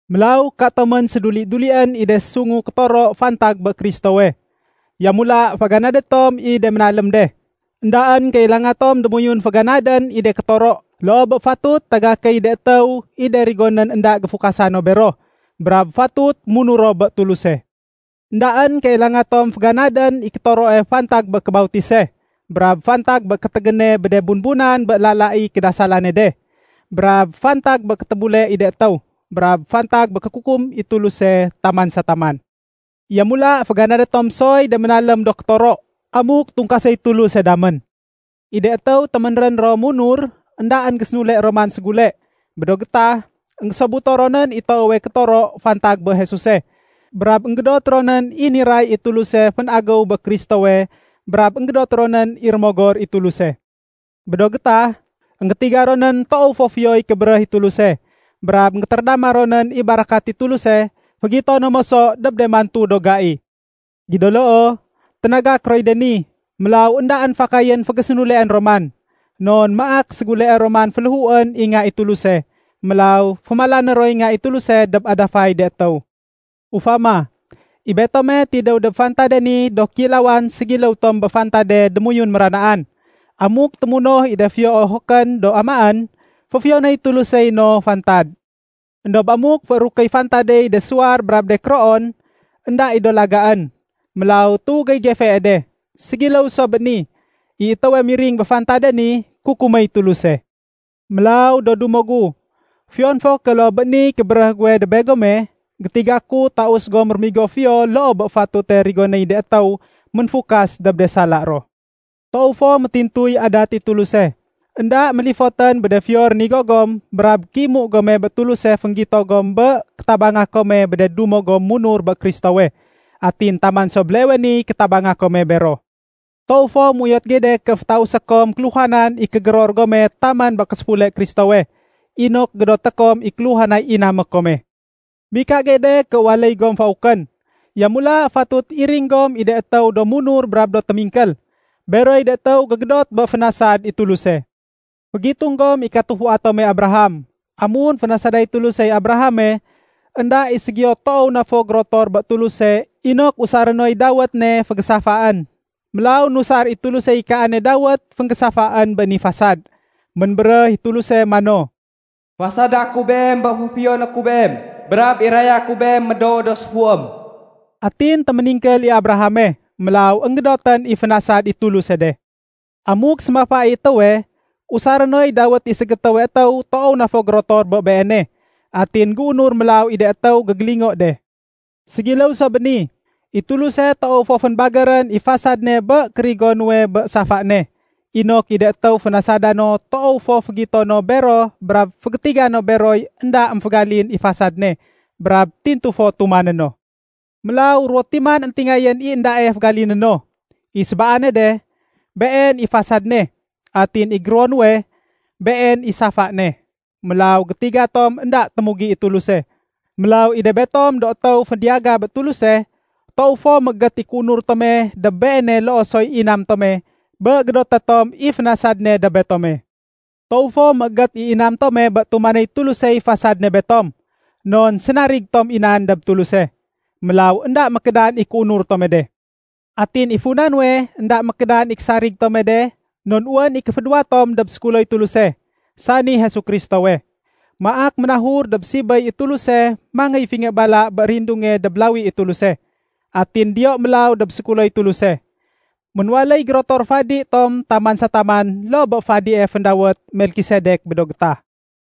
Mélaw katomén séduli-dulién i de sungu kétoro fantag bé Kristowe. Yamula féganadé tom i de ménalém de. Endaén kailanga tom démoyun féganadén i de kétoro, loo bé fatut tagakéy de étéw i de rigonén énda géfukasa no bero, brab fatut munur ro bé Tuluse. Endaén kailanga tom féganadén i kétoroe fantag bé kébautise, brab fantag bé kétégéne bé de bunbunan bé lala i kédasalane de, brab fantag bé kétébule i de étéw, brab fantag bé kékukum i Tuluse taman sa taman. Yamula féganadé tom soy de ménalém do kétoro, amuk tungkaséy Tuluse damén. I de étéw téménrén ro munur, éndaén gésénule ro man ségule. Bé do gétah, énggésobuto ronén i toowe kétoro fantag bé Jesuse. Brab énggédot ronén i niray i Tuluse fénagéw dob Kristowe brab énggédot ronén i Rémogor i Tuluse. Bé do gétah, énggétiga ronén toow fo fiyoy kébéréh i Tuluse. Brab énggétérédama ronén i barakat i Tuluse fégito no moso dob de mantu do gai. Gido loo, ténagak roy de ni. Mélaw éndaén fakayén fégésénuleén ro man. Non maak séguleé ro man féléhuén i Nga i Tuluse. Mélaw fémalané roy Nga i Tuluse dob adafay de étéw. Ufama, i betome tidéw dob fantade ni do kéilawan ségiléw tom bé fantade démoyun méranaan. Amuk témunoh i de fiyo ohokén do amaén, féfiyonéy Tulusey no fantad. Endob amuk féérukéy fantadey de suwar brab de kéroon, énda i do lagaén. Mélaw tuwégéy gefee de. Ségiléw so bé ni, i étéwe miring bé fantade ni, kukuméy Tuluse. Mélaw, do dumo gu, fiyon fo ké loo bé niy kébéréh guwe dob begome, gétiga ku taus gom rémigo fiyo loo bé fatute rigonéy de étéw ménfukas dob de sala ro. Toow fo métintuy adat i Tuluse. Enda mélifotén bé de fiyo rénigo gom brab kéimu gome bé Tuluse fénggito gom bé kétabanga kome bé de dumo gom munur bé Kristowe. Atin taman so béleewe niy kétabanga kome bero. Toow fo méuyot gey de ké fétausé kom kéluhanan i kégéror gome taman bé késéfule Kristowe, inok gédoté kom i kéluhanay inamé kome. Mika gey de ké waléy gom faukén. Yamula fatut iring gom i de étéw do munur brab do témingkél. Beroy de étéw gégédot bé fénasad i Tuluse. Fégitung gom i katufua tome Abraham. Amun fénasaday Tulusey Abrahame, énda i ségiyo toow na fo gérotor bé Tuluse inok usaré noy dawét ne fégésafaén. Mélaw nusar i Tulusey kaane dawét fénggésafaén bé ni fasad. Ménbéréh i Tuluse mano, “Fasada ku beem bé féfiyoné ku beem brab iraya ku beem médoo do séfuém.” Atin téméningkél i Abrahame, mélaw énggédotén i fénasad i Tuluse de. Amuk sémafa i étéwe, usaré noy dawét i ségétéwe étéw toow na fo gérotor bé beene. Atin géunur mélaw i de étéw gégélingo de. Ségiléw so bé ni, i Tuluse toow fo fénbagérén i fasad ne bé kérigo nuwe bé safa ne, inok i de étéw fénasada no toow fo fégito no bero brab fégétiga no beroy énda émfégalin i fasad ne brab tintu fo tumané no. Mélaw ruwo timan éntingayén i éndae fégaliné no. I sébaane de, been i fasad ne. Atin i géruwono nuwe, been i safa ne. Mélaw gétiga tom énda témugi i Tuluse. Mélaw i de betom do étéw fédiyaga bé Tuluse, toow fo méégét i kéunur tome dob Beene loo soy inam tome bé gédoté tom i fénasad ne dob betome. Toow fo méégét i inam tome bé tumanéy Tulusey fasad ne betom. Non sénarig tom i nan dob Tuluse. Mélaw énda mékédan i kéunur tome de. Atin i funa nuwe énda mékédan i késarig tome de non wén i kéfédéwa tom dob sékuloy Tuluse, sani Jesu Kristowe. Maak ménahur dob sibéy i Tuluse mangéy fingé bala bé rindunge dob lawi i Tuluse. Atin diyo mélaw dob sékuloy Tuluse. Ménwaléy gérotor fadi tom taman sa taman loo bé fadie féndawét Melkisedek bé do gétah.